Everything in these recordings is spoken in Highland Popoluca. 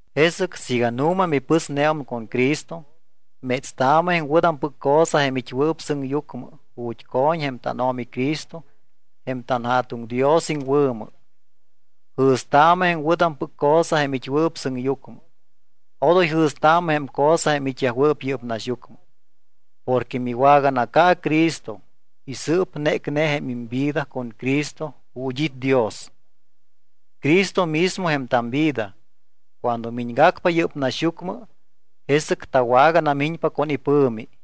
Jesɨc siiga nu̱ma mipɨsneum con Cristo, métstaamɨ jém wɨ̱tampɨc cosa jém it́wɨɨp sɨŋyucmɨ ju̱t́ co̱ñ jém tánO̱mi Cristo jém tanJa̱tuŋ Dios iŋwɨ̱mɨ. Jɨ̱staamɨ jém wɨ̱tampɨc cosa jém it́wɨɨp sɨŋyucmɨ. Odoy jɨ̱staamɨ jém cosa jém it́yajwɨɨp yɨ́p naxyucmɨ. Porque miwaganaca Cristo y sɨɨp nécne jém imvida con Cristo ju̱t́ it́ Dios. Cristo mismo jém tamvida. Cuando miñgacpa yɨ́p naxyucmɨ, jesɨc tawaganamiñpa con ipɨ̱mi.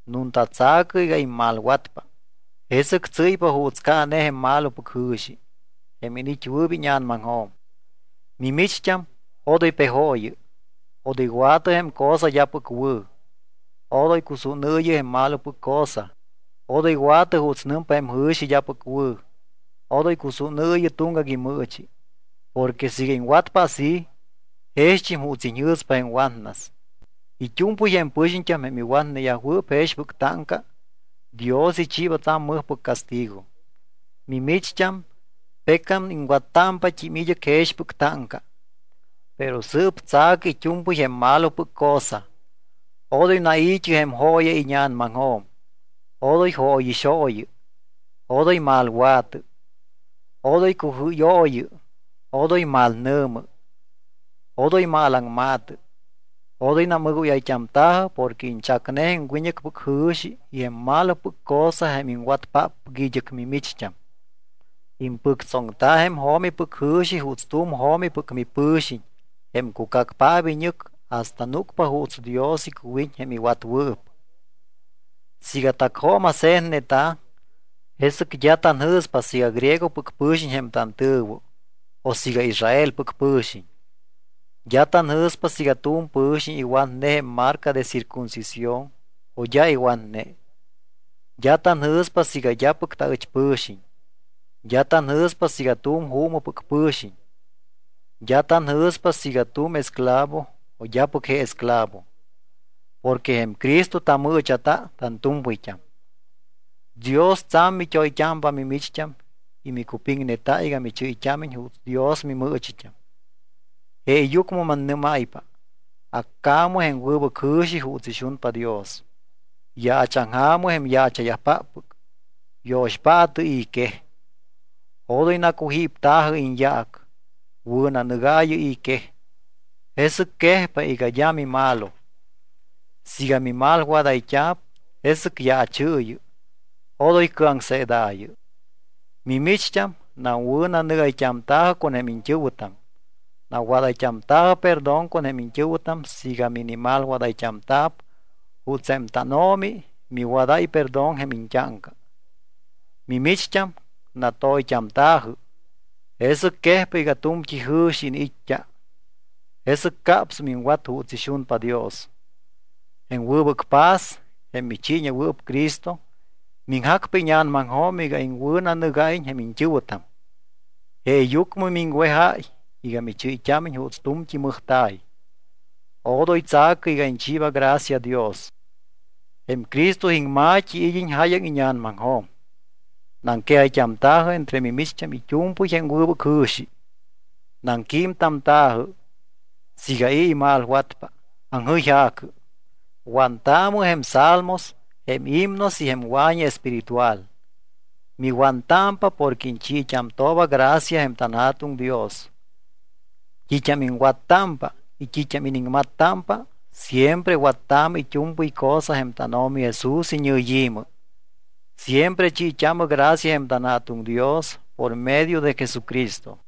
Nunta tsa̱cɨ iga immalwatpa, jesɨc tsɨ́ypa juuts caane jém malopɨc jɨ̱xi, jém iniit́wɨɨp íña̱namaŋjo̱m. Mimicht́am, odoy pejooyɨ. Odoy wa̱tɨ jém cosa d́apɨc wɨ̱. Odoy cusúnɨɨyɨ jém malopɨc cosa. Odoy wa̱tɨ juuts nɨmpa jém jɨ̱xi d́apɨc wɨ̱. Odoy cusúnɨɨyɨ tuŋgac imɨɨchi, porque siiga iŋwatpa así, jext́im juuts iga iñjɨ̱spa jém watnas. It́u̱mpɨy jém pɨxiñt́am, jém iwatneyajwɨɨp jexpɨc táŋca, Dios ichiiba tsa̱m mɨjpɨc castigo. Mimicht́am, pecam iŋwattámpat́im id́ɨc jexpɨc táŋca. Pero sɨɨp tsa̱cɨ it́u̱mpɨy jém malopɨc cosa. Odoy nai̱t́ɨ jém jooya íña̱namaŋjo̱m. Odoy jóyixooyɨ. Odoy malwa̱tɨ. Odoy cujɨ́yooyɨ. Odoy malnɨ̱mɨ. Odoy malaŋma̱tɨ. Odoy namɨgóyayt́amta̱jɨ porque iñchacne jém wiñɨcpɨc jɨ̱xi y jém malopɨc cosa jém iŋwatpáppɨc id́ɨc mimicht́am. Impɨctsoŋta jém jo̱mipɨc jɨ̱xi juuts tu̱m jo̱mipɨc mipɨ̱xiñ, jém cucacpaap iñɨc hasta núcpa juuts Dios icuwiñ jém iwatwɨɨp. Siiga tacjooma̱se̱tneta̱, jesɨc d́a tanjɨ̱spa siiga griegopɨc pɨ̱xiñ jém tantɨ̱wɨ o siiga Israelpɨc pɨ̱xiñ. D́a tanjɨ̱spa siiga tu̱m pɨ̱xiñ iwatne jém marca de circuncisión o d́a iwatne. D́a tanjɨ̱spa siiga d́apɨc taɨch pɨ̱xiñ. D́a tanjɨ̱spa siiga tu̱m juumɨpɨc pɨ̱xiñ. D́a tanjɨ̱spa siiga tu̱m esclavo o d́apɨc je esclavo. Porque jém Cristo tamɨɨcha̱ta tantu̱mpɨyt́am. Dios tsa̱m mit́oyt́ámpa mimicht́am y micupiŋneta iga michɨ́yt́ámiñ juuts Dios mimɨɨchit́am. Jeeyucmɨ mannɨ́máypa, accaamɨ jém wɨbɨc jɨ̱xi juuts ixunpa Dios. Yaachaŋja̱mɨ jém yaacha̱yajpáppɨc. Yo̱xpaatɨ i̱ quej. Odoy nacujípta̱jɨ iñyaac. Wɨ̱nanɨgaayɨ i̱ quej, jesɨc quejpa iga d́a mimalo. Siiga mimalwadayt́a̱p, jesɨc yaachɨɨyɨ, odoy cɨaŋseedaayɨ. Mimicht́am nawɨ̱nanɨgayt́amta̱jɨ con jém iñt́ɨ̱wɨtam. Nawadayt́amta̱jɨ perdón con jém iñt́ɨ̱wɨtam siiga minimalwadayt́amta̱p juuts jém tánO̱mi miwadáy perdón jém iñt́áŋca. Mimicht́am, natoyt́amta̱jɨ, jesɨc quejpa iga tu̱mt́i jɨ̱xi iniit́t́a. Jesɨc capsum iŋwat juuts ixunpa Dios. Jém wɨbɨc paz, jém michiiñewɨɨp Cristo, miŋjacpa íña̱namaŋjo̱m iga iŋwɨ̱nanɨgáyiñ jém tantɨ̱wɨtam. Jeeyucmɨ miŋwejáy iga michɨ́yt́ámiñ juuts tu̱mt́i mɨjta̱y. Odoy tsa̱cɨ iga iñchiiba gracia Dios. Jém Cristo iŋma̱t́i id́iñ jáyaŋ íña̱namaŋjo̱m. Naŋquejayt́amta̱jɨ entre mimicht́am it́u̱mpɨy jém wɨbɨc jɨ̱xi. Naŋquímtamta̱jɨ. Siiga i̱ imalwatpa, aŋjɨyja̱cɨ. Wantaamɨ jém salmos, jém himnos y jém wa̱ñi espíritual. Miwantámpa porque iñchiit́amtooba gracia jém tanJa̱tuŋ Dios. T́it́am iŋwattámpa y t́it́am iniŋmattámpa, siempre wattaamɨ it́u̱mpɨy cosa jém tánO̱mi Jesús iñɨyi̱mɨ. Siempre chiit́aamɨ gracia jém tanJa̱tuŋ Dios por medio de Jesucristo.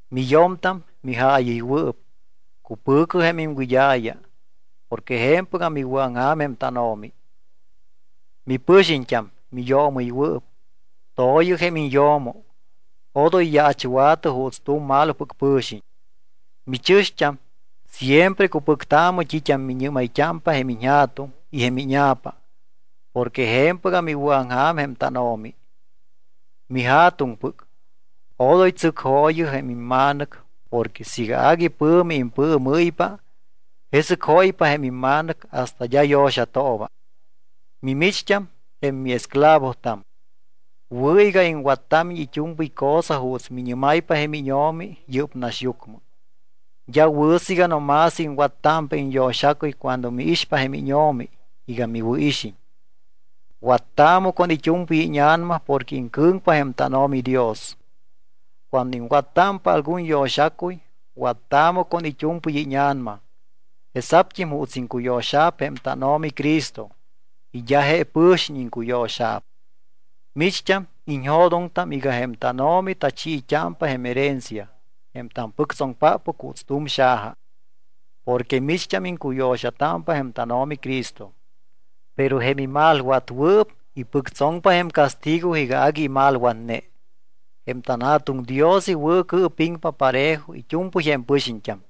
Miyo̱mtam, mijaayɨywɨɨp, cupɨ̱cɨ jém iŋwɨd́a̱ya porque je̱mpɨgam iwɨ̱aŋja̱m jém tánO̱mi. Mipɨxiñt́am, miyoomɨywɨɨp, to̱yɨ jém iñyo̱mo, odoy yaachwa̱tɨ juuts tu̱m malopɨc pɨ̱xiñ. Michɨ̱xt́am, siempre cupɨctaamɨ t́it́am miñɨ́mayt́ámpa jém iñja̱tuŋ y jém íña̱pa porque je̱mpɨgam iwɨ̱aŋja̱m jém tánO̱mi. Mija̱tuŋpɨc, odoy tsɨcjooyɨ jém imma̱nɨc porque siiga agui pɨ̱mi impɨɨmɨ́ypa, jesɨc jóypa jém imma̱nɨc hasta d́a yo̱xatooba. Mimicht́am, jém miesclavotam, wɨ̱ iga iŋwattámiñ it́u̱mpɨy cosa juuts miñɨ́máypa jém íño̱mi yɨ́p naxyucmɨ. D́a wɨ̱ siiga no más iŋwattámpa iñyo̱xacuy cuando miixpa jém íño̱mi iga miwɨ̱ixiñ. Wattaamɨ con it́u̱mpɨy íña̱nama porque iŋcɨ̱ŋpa jém tánO̱mi Dios. Cuando iŋwattámpa algun yo̱xacuy, wattaamɨ con it́u̱mpɨy íña̱nama jesa̱pt́im juuts iŋcuyo̱xa̱p jém tánO̱mi Cristo y d́a je pɨ̱xiñ iŋcuyo̱xa̱p. Micht́am iñjo̱doŋtam iga jém tánO̱mi tachiit́ámpa jém herencia, jém tampɨctsoŋpáppɨc juuts tu̱m xaja, porque micht́am iŋcuyo̱xatámpa jém tánO̱mi Cristo. Pero jém imalwatwɨɨp ipɨctsoŋpa jém castigo iga agui imalwatne. Jém tanJa̱tuŋ Dios iwɨ̱cɨɨpiŋpa parejo it́u̱mpɨy jém pɨxiñt́am.